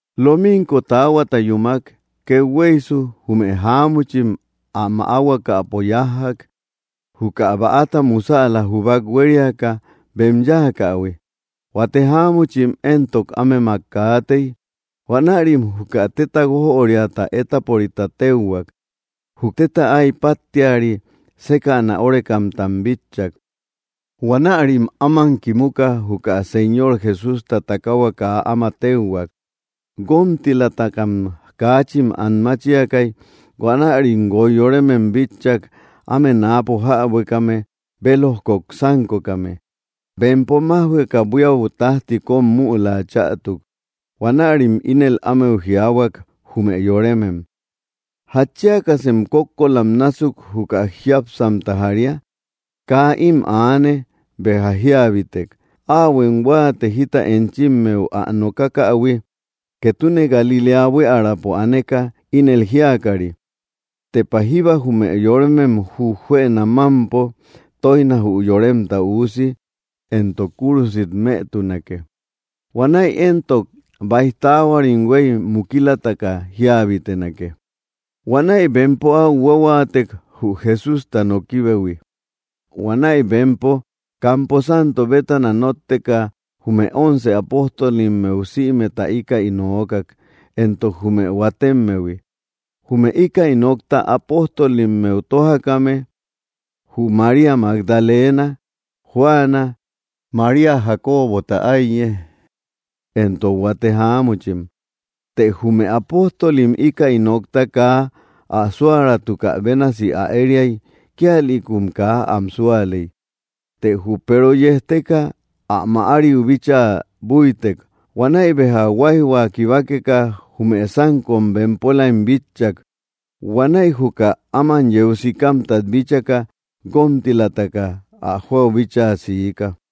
Lominko taahuata yúmak, kethueysu, jume jáamuchim ä maahuakäpo yájjak, juka bäata musälam jubak huériaka bem yáakähui. Huate jáamuchim éntok, ámemak kaatey. Huanärim juka téta guójöriata étaporita téuhuak. Jü téta ái páttiari sékäna órekamtam bitchak. Huanärim áman kimuka, juka Señor Jesústa takahua kaa áma téuhuak. Guómtilamtakam kaachin an máchiakay. Huanärim guoy yoremem bitchak, áme náapo jäbuekame bélojkok sánkokame. Bempo májhueka, buíau tájti kóm müla chätuk. Huanärim ínel ámeu jiaahuak, jume yoremem: —¿Jatchiakasem kókkolam násuk juka jiápsamta jaria? Kaa ím aane; béja jíabitek. Áhuem huáate jita enchimmeu ä nokakähui, ketune Galiléa buiärapo aneka, ínel jíakari: “Tepa jíba jume yoremem jujuënam mámpo tóijna jü Yoremta Üusi, éntok kúrusit mëtunake. Huanäi éntok báij taahuarim huéy mukilataka jíabitenake.” Huanäi bempo áu huahuaatek, jü Jesústa nokibehui. Huanäi bempo campo santo bétana nótteka, jume once apóstolimmeu sïmeta íkäi nookak, éntok jume huatemmehui. Jume íkäi nokta apóstolimmeu tójakame: jü María Magdalena, Juana, María Jacobota áiye, éntok huate jáamuchim. Të jume apóstolim íkäi nokta kaa ä súäratukä bénasi ä ériay; kíalïkum kaa am súaley. Të jü Peero yejteka, ä mäariu bíchaa búitek. Huanäi béja huáijhua kibakeka, jume sánkom bempolaim bitchak. Huanäi juka áman yeu sikamtat bíchaka, guómtilataka ä jóau bíchaa siika.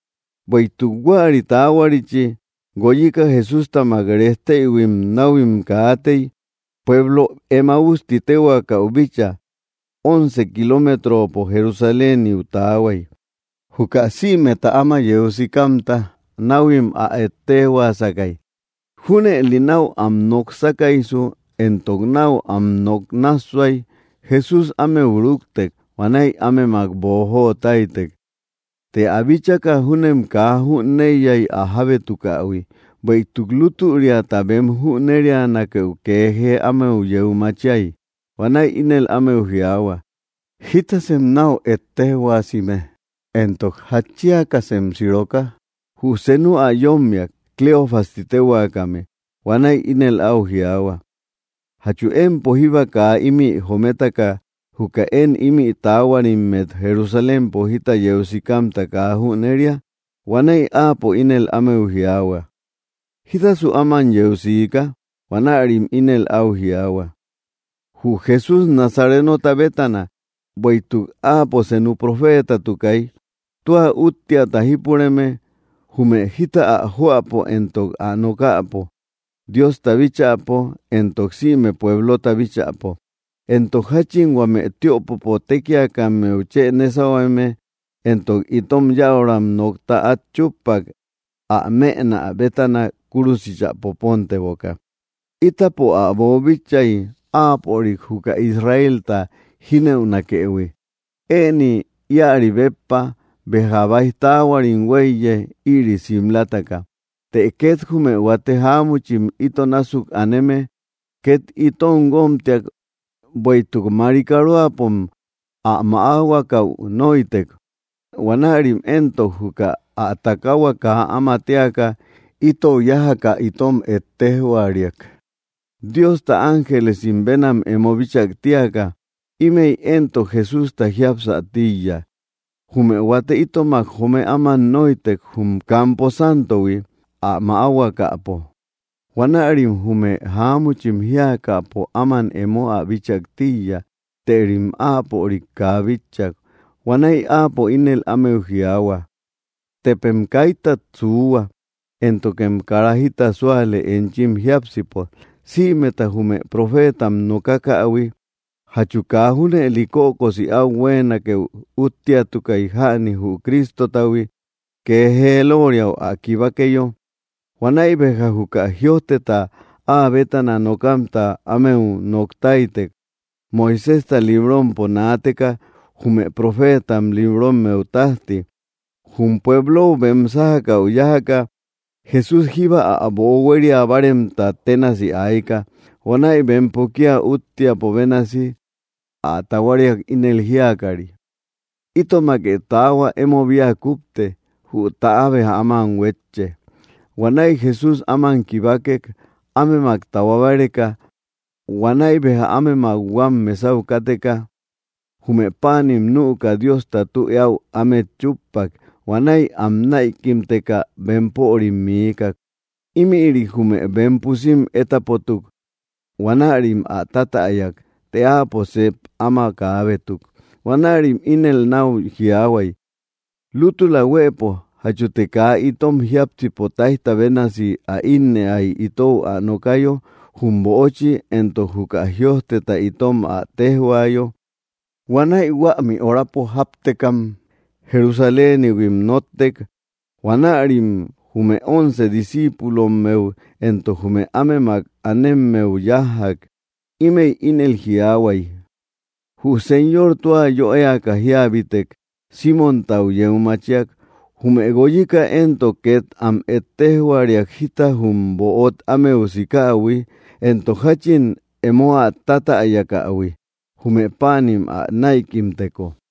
Bueïtuk huäri taahuarichi, guoyika Jesústamak rejteïhuim náhuim kaatey, pueblo Emáus ti téhuaakäu bíchaa; once kiloometropo Jerusaléniu taahuay. Juka sïmeta áma yeu sikamta, náhuim ä ejtejhuaasakay. Júnëli náu am nok sákaysu éntok náu am nok nássuay, Jesús ámeu rúktek. Huanäi ámemak boojo táytek. Të ä bíchaka, júnem kaa jüneiyay ä jábétukähui, bueïtuk lútüriata bem jüneríanakeu kee jee ámeu yeu machiay. Huanäi ínel ámeu jiaahua: —¿Jítasem náu ejtejhuaasime, éntok jatchiakasem siroka? Jü senu ä yómmiak, Cleofas ti téhuaakame. Huanäi ínel áu jiaahua: —¿Jachu empo jíba kaa ímï jometaka juka én ímï taahuarimmet Jerusalémpo jita yeu sikamta kaa jüneria? Huanäi áapo ínel ámeu jiaahua: —¿Jítasu áma yeu siika? Huanärim ínel áu jiaahua: —Jü Jesús Nazarenota bétana, bueïtuk áapo senu profeetatukay, tua úttiata jípureme jume jita ä joäpo éntok ä nokäpo, Diosta bíchäpo éntok sïme pueblota bíchäpo; éntok jáchin huame tiöpopo tékiakammeu chë nésahueme éntok itom yäuram nokta át chúppak, ä mënä bétana kúrusichä poponteboka. Ítapo ä boobíchaïhuiy, áapörik juka Israelta jínëunakëhui. Ëni íäri béppa, béja báij taahuarim huéiye, ïri simlataka. Të két jume huate jáamuchim ito násuk aneme két itom guómtiak, bueïtuk marikaroapom ä maahuakäu nóitek. Huanärim éntok juka ä takahua kaa áma téaka, itou yájaka itom ejtejhuariak, Diosta ángelesim bénam emo bíchak tíaka. Ímëi éntok Jesústa jiapsä tíiya. Jume huate itomak joome áman nóitek, jum campo santohui, ä maahuakäpo. Huanärim jume jáamuchim jíakäpo áman emo ä bíchak tíiya, tërim áapörik kaa bitchak. Huanäi áapo ínel ámeu jiaahua: —¡Tepem kaitat suuhua, éntokem kara jita súale enchim jiápsipo, sïmeta jume profeetam nokakähui! ¿Jachu kaa junëli kökosi áu ä huéenakeu úttiatukay jäni jü Cristotahui, kee jee lóoriau ä kibakeyo? Huanäi béja juka jïojteta áa bétana nokamta ámeu nok táytek, Moiséjta librompo naateka jume profeetam librommeu tájti. Jum pueblou bem sájakäu yájaka, Jesús jíba ä böo huéria báarem ténasi ayka. Huanäi bempo kía úttiapo bénasi ä tahuariak, ínel jíakari: —Itomake taahua, emo bia kúpte, jü täa béja áman huétche. Huanäi Jesús áman kibakek, ámemak tahua báreka. Huanäi béja ámemak huam mesau káteka, jume páanim nüka Diosta tü eáu ámet chúppak. Huanäi am näikimteka, bempörim miikak. Ímïri jume bem pusim étapotuk. Huanärim ä tatäyak, të áapo sep áma kaabétuk. Huanärim ínel náu jiaahuay: —¿Lútula huëpo, jachute kaa itom jiápsipo táijta bénasi ä ínnëay, itou ä nokayo jum böochi, éntok juka jïojteta itom ä téjhuayo? Huanäi huämi horapo jáptekam, Jerusalénihuim nóttek. Huanärim jume once discíipulommeu éntok jume ámemak anemmeu yájjak. Ímëi ínel jiaahuay: —Jü Señor tua yö éaka jíabitek; Símontau yeu machiak. Jume guoyika éntok két am ejtejhuariak jita jum böot ámeu sikähui, éntok jáchin emo ä tatäyakähui, jume páanim ä näikimteko.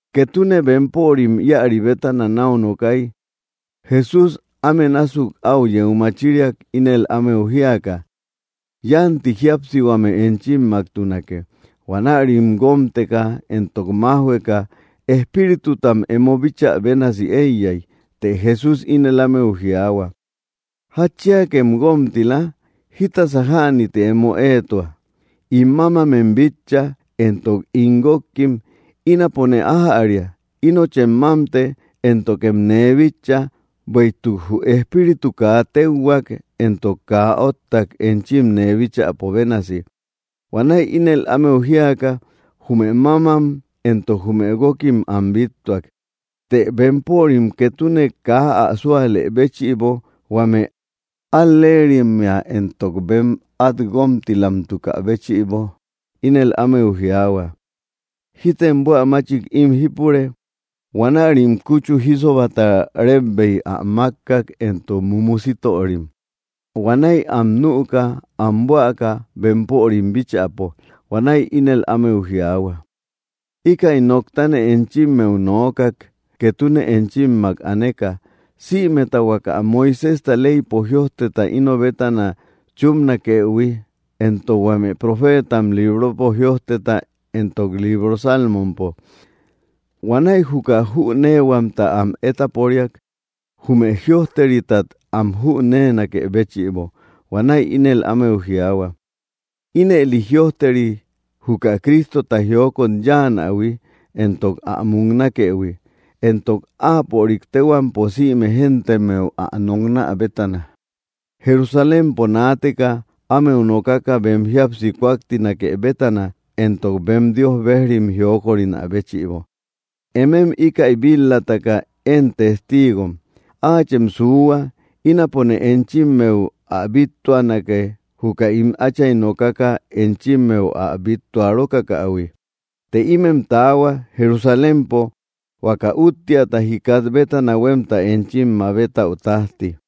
Ketune bempörim íäri bétana náu nokay, Jesús áme násuk áu yeu machiriak, ínel ámeu jíaka: —Yánti jíapsihuame enchimmaktunake. Huanärim guómteka éntok májhueka, espíritutam emo bíchä bénasi éiyay. Të Jesús ínel ámeu jiaahua: —¿Jatchiakem guómtila? ¿Jítasa jäni ti emo éetua? In mámamem bitcha, éntok ín guókkim. Ínapone ájäria. Inochem mámte, éntokem nee bitcha; bueïtuk jü espíritu kaa tekhuak, éntok kaa óttak, enchim nee bíchäpo bénasi. Huanäi ínel ámeu jíaka, jume mámam éntok jume guókim am bíttuak. Të bempörim ketune kaa ä súalë béchïbo huame al‑leerimmea éntok bem át guómtilamtukä béchïbo, ínel ámeu jiaahua: —¿Jítem buä máchik ím jípure? Huanärim kúchu jísobata rébbeik ä mákkak, éntok mumu sítörim. Huanäi am nüka, am buäka bempörim bíchäpo. Huanäi ínel ámeu jiaahua: —Íkäi noktane enchimmeu nookak, ketune enchimmak aneka: Sïmeta huaka Moiséjta leypo jïojteta ino bétana chúpnakëhui, éntok huame profeetam libropo jïojteta éntok libro salmompo. Huanäi juka jüneehuamta am étaporiak, jume jïojteritat am jüneenakë béchïbo. Huanäi ínel ámeu jiaahua: —Ínëli jïojteri: juka Cristota jiokot yáanahui, éntok ä muknakëhui, éntok áapörik téhuampo sïme géntemmeu ä noknä bétana, Jerusalémpo naateka, ámeu nokaka bem jíapsi kúaktinake bétana, éntok bem Dios bejrim jíokörina béchïbo. Emem íkäi bit‑lataka én testiigom. Áachem suuhua, ínapone enchimmeu ä bíttuanake, juka ín Átchay nokaka enchimmeu ä bíttua‑rokakähui. Të ímem taahua, Jerusalémpo, huaka úttiata jikat bétana huémta enchim mabetäu tájti.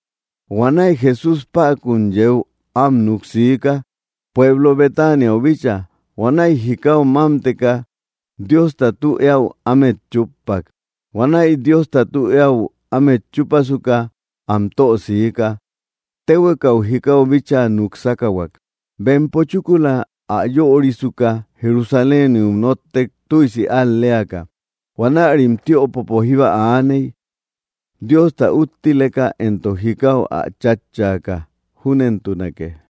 Huanäi Jesús päkun yeu am núk siika, pueblo Betaniau bíchaa. Huanäi jikau mámteka, Diosta tü eáu ámet chúppak. Huanäi Diosta tü eáu ámet chúpasuka, am tö siika. Téhuekau jikau bíchaa núk sákahuak. Bempo chúkula ä yörisuka, Jerusaléniu nóttek, tüisi al‑leaka. Huanärim tiöpopo jíba aaney, Diosta úttileka entok jikau ä chatchaka. Júnentunake.